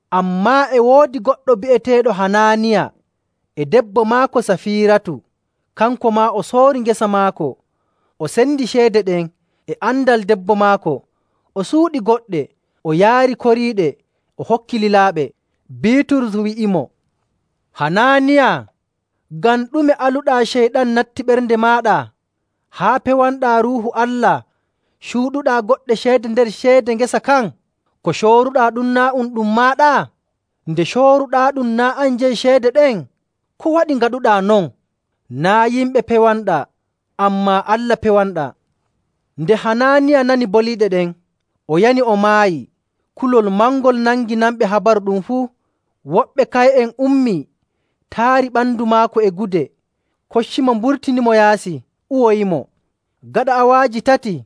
Ammaa e woodi goɗɗo bi'eteeɗo Hanaaniya e debbo maako Safiiratu. Kanko maa o soori ngesa maako. O sendi ceede ɗen e andal debbo maako. O suuɗi goɗɗe o yaari koriiɗe o hokki lilaaɓe. Biiturus wi'imo, “Hanaaniya, ngam ɗume aluɗaa Ceyɗan natti ɓernde maaɗa haa pewanɗaa Ruuhu Allah, cuuɗuɗaa goɗɗe ceede nder ceede ngesa kan? Ko cooruɗaa ɗum, naa' um ɗum maaɗa? Nde cooruɗaaɗum naa' an jeyi ceede ɗen? Ko waɗi ngaɗuɗaa non? Naa' yimɓe pewanɗaa, ammaa Allah pewanɗaa.” Nde Hanaaniya nani boliiɗe ɗen, o yani o maayi. Kulol mangol nangi nanɓe habaru ɗum fuu. Woɓɓe kaye'en ummii, taari ɓandu maako e gude, koccimo, mburtinimo yaasi, uwoyimo. Gaɗa awaaji tati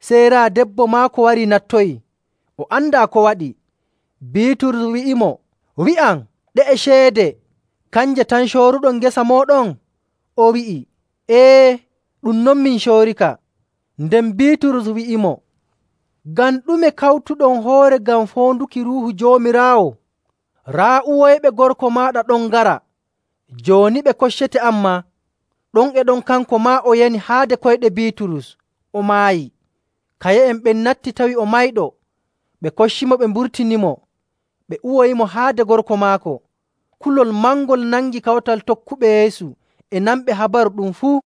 sey raa debbo maako wari nattoyi. O andaa ko waɗi. Biiturus wi'imo, “Wi'am, ɗe'e ceede kanje tan cooruɗon ngesa mooɗon?” O wi'i, “Ee, ɗum non min coorika.” Nden Biiturus wi'imo, “Ngam ɗume kawtuɗon hoore ngam foonduki Ruuhu Joomiraawo? Raa, uwoyɓe gorko maaɗa ɗon ngara, jooni ɓe koccete an maa!” Ɗon e ɗon kanko maa o yani haade koyɗe Biiturus, o maayi. Kaye'en ɓen natti tawi o mayɗo, ɓe koccimo ɓe mburtinimo, ɓe uwoyimo haade gorko maako. Kulol mangol nangi kawtal tokkuɓe Yeesu e nanɓe habaru ɗum fuu.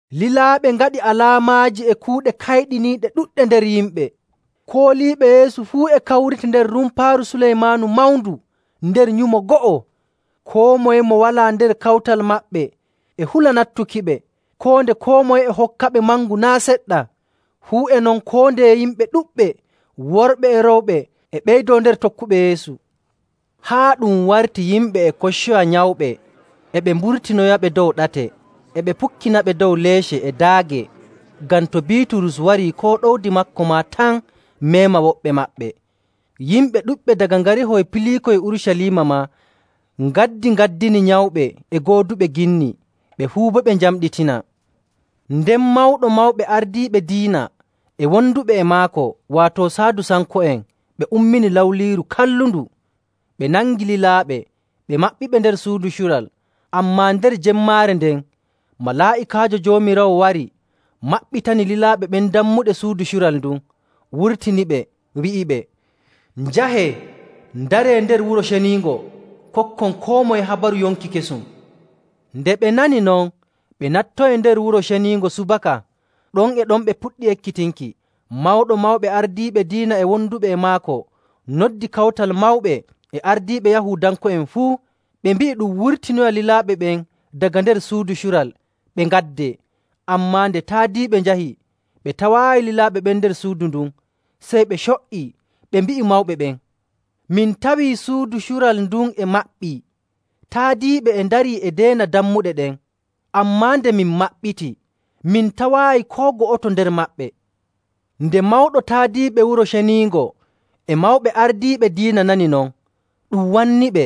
Lilaaɓe ngaɗi alaamaaji e kuuɗe kayɗiniiɗe ɗuɗɗe nder yimɓe. Kooliiɓe Yeesu fuu e kawrita nder Rumpaaru Suleymaanu mawndu nder nyumo go'o. Koo moye mo walaa nder kawtal maɓɓe e hula nattukiɓe, koo nde koo moye e hokkaɓe mangu naa' seɗɗa. Fuu e non koo ndeye yimɓe ɗuɗɓe, worɓe e rewɓe, e ɓeydoo nder tokkuɓe Yeesu, haa ɗum warti yimɓe e koccoya nyawɓe, e ɓe mburtinoyaɓe dow ɗate, e ɓe pukkinaɓe dow leece e daage, ngam to Biiturus warii koo ɗowdi maako maa tan meema woɓɓe maɓɓe. Yimɓe ɗuɗɓe daga ngarihoy piliikoy Urucaliima maa ngaddingaddini nyawɓe e gooduɓe ginni. Ɓe fuu boo ɓe njamɗitinaa. Nden Mawɗo Mawɓe Ardiiɓe Diina e wonduɓe e maako, waato Saadusanko'en, ɓe ummini lawliiru kallundu. Ɓe nangi lilaaɓe, ɓe maɓɓiɓe nder suudu cural. Ammaa nder jemmaare nden malaa'ikaajo Joomiraawo wari maɓɓitani lilaaɓe ɓen dammuɗe suudu cural ndun, wurtiniɓe, wi'iɓe, “Njahee ndaree nder Wuro Ceniingo, kokkon koo moye habaru yonki kesum.” Nde ɓe nani non, ɓe nattoyi nder Wuro Ceniingo subaka, ɗon e ɗon ɓe puɗɗi ekkitinki. Mawɗo Mawɓe Ardiiɓe Diina e wonduɓe e maako noddi Kawtal Mawɓe e ardiiɓe Yahuudanko'en fuu. Ɓe mbi'i ɗum wurtinoya lilaaɓe ɓen daga nder suudu cural, ɓe ngaddee. Ammaa nde taadiiɓe njahi, ɓe tawaayi lilaaɓe ɓen nder suudu ndun. Sey ɓe co''ii, ɓe mbi'i mawɓe ɓen, “Min tawii suudu cural ndun e maɓɓii, taadiiɓe e ndarii e ndeena dammuɗe ɗen, ammaa nde min maɓɓiti, min tawaayi koo go'oto nder maɓɓe!” Nde mawɗo taadiiɓe Wuro Ceniingo e mawɓe ardiiɓe diina nani non, ɗum wanniiɓe,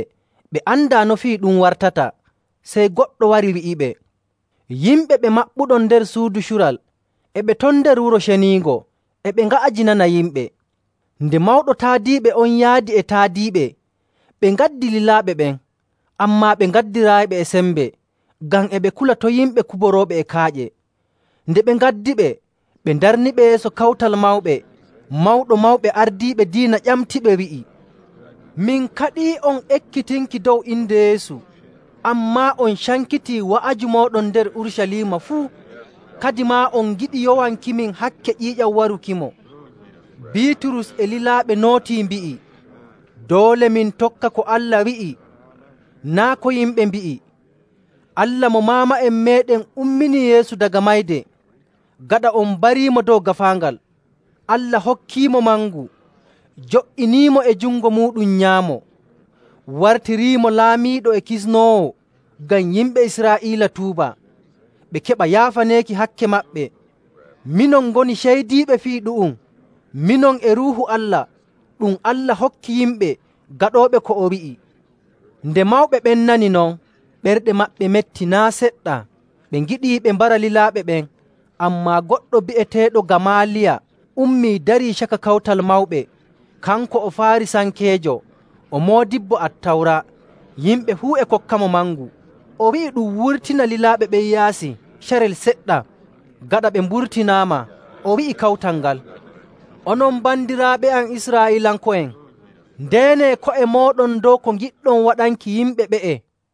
ɓe andaa no fii ɗum wartata. Sey goɗɗo wari, wi'iɓe, “Yimɓe ɓe maɓɓuɗon nder suudu cural e ɓe ton nder Wuro Ceniingo e ɓe nga'ajinana yimɓe!” Nden mawɗo taadiiɓe on yaadi e taadiiɓe, ɓe ngaddi lilaaɓe ɓen. Ammaa ɓe ngaddiraayiɓe e sembe, ngam e ɓe kula to yimɓe kuborooɓe e kaaƴe. Nde ɓe ngaddiɓe, ɓe ndarniɓe yeeso Kawtal Mawɓe. Mawɗo Mawɓe Ardiiɓe Diina ƴamtiɓe, wi'i, “Min kaɗii'on ekkitinki dow inde Yeesu, ammaa on cankitii wa'aju mooɗon nder Urucaliima fuu. Kadimaa on ngiɗi yowankimin hakke ƴiiƴam warukimo.”. Biiturus e lilaaɓe nootii, mbi'i, “Doole min tokka ko Allah wi'i, naa' ko yimɓe mbi'i. Allah mo maama'en meeɗen umminii Yeesu daga mayde, gaɗa on mbariimo dow gaafaangal. Allah hokkiimo mangu, jo''iniimo e jungo muuɗum nyaamo, wartiriimo laamiiɗo e kisnoowo, ngam yimɓe Israa'iila tuuba, ɓe keɓa yaafaneeki hakke maɓɓe. Minon ngoni ceydiiɓe fii ɗu'um, minon e Ruuhu Allah ɗum Allah hokki yimɓe gaɗooɓe ko o wi'i.” Nde mawɓe ɓen nani non, ɓerɗe maɓɓe metti naa' seɗɗa, ɓe ngiɗii ɓe mbara lilaaɓe ɓen. Ammaa goɗɗo bi'eteeɗo Gamaaliya ummii darii caka Kawtal Mawɓe. Kanko o Faarisankeejo o moodibbo Attawra, yimɓe fuu e kokkamo mangu. O wi'i ɗum wurtina lilaaɓe ɓen yaasi carel seɗɗa. Gaɗa ɓe mburtinaama, o wi'i kawtal ngal, “Onon bandiraaɓe am Israa'iilanko'en, ndeenee ko'e mooɗon dow ko ngiɗɗon waɗanki yimɓe ɓe'e.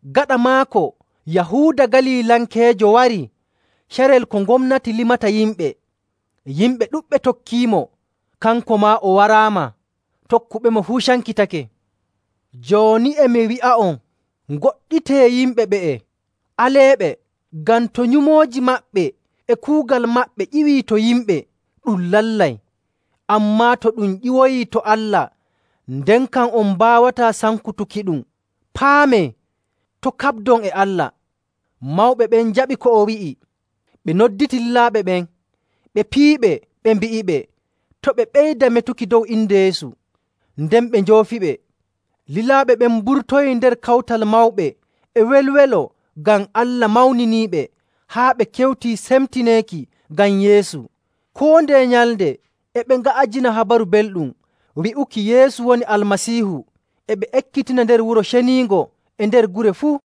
Gaɗa maako, Yahuuda Galilankeejo warii carel ko gomnati limata yimɓe, yimɓe ɗuɗɓe tokkiimo. Kanko maa o waraama, tokkuɓemo fuu cankitake. Jooni, e mi wi'a'on, ngoɗɗitee yimɓe ɓe'e, aleeɓe. Ngam to nyumooji maɓɓe e kuugal maɓɓe ƴiwii to yimɓe, ɗum lallay. Ammaa to ɗum ƴiwoyii to Allah, nden kam on mbaawataa sankutukiɗum. Paamee to' kaɓdon e Allah!” Mawɓe ɓen njaɓi ko o wi'i. Ɓe nodditi lilaaɓe ɓen, ɓe piyiɓe, ɓe mbi'iɓe to' ɓe ɓeyda metuki dow inde Yeesu. Nden ɓe njoofiɓe. Lilaaɓe ɓen mburtoyii nder Kawtal Mawɓe e welwelo ngam Allah mawniniiɓe haa ɓe kewtii semtineeki ngam Yeesu. Koo ndeye nyalnde e ɓe nga'ajina Habaru Belɗum wi'uki Yeesu woni Almasiihu, e ɓe ekkitina nder Wuro Ceniingo e nder gure fuu.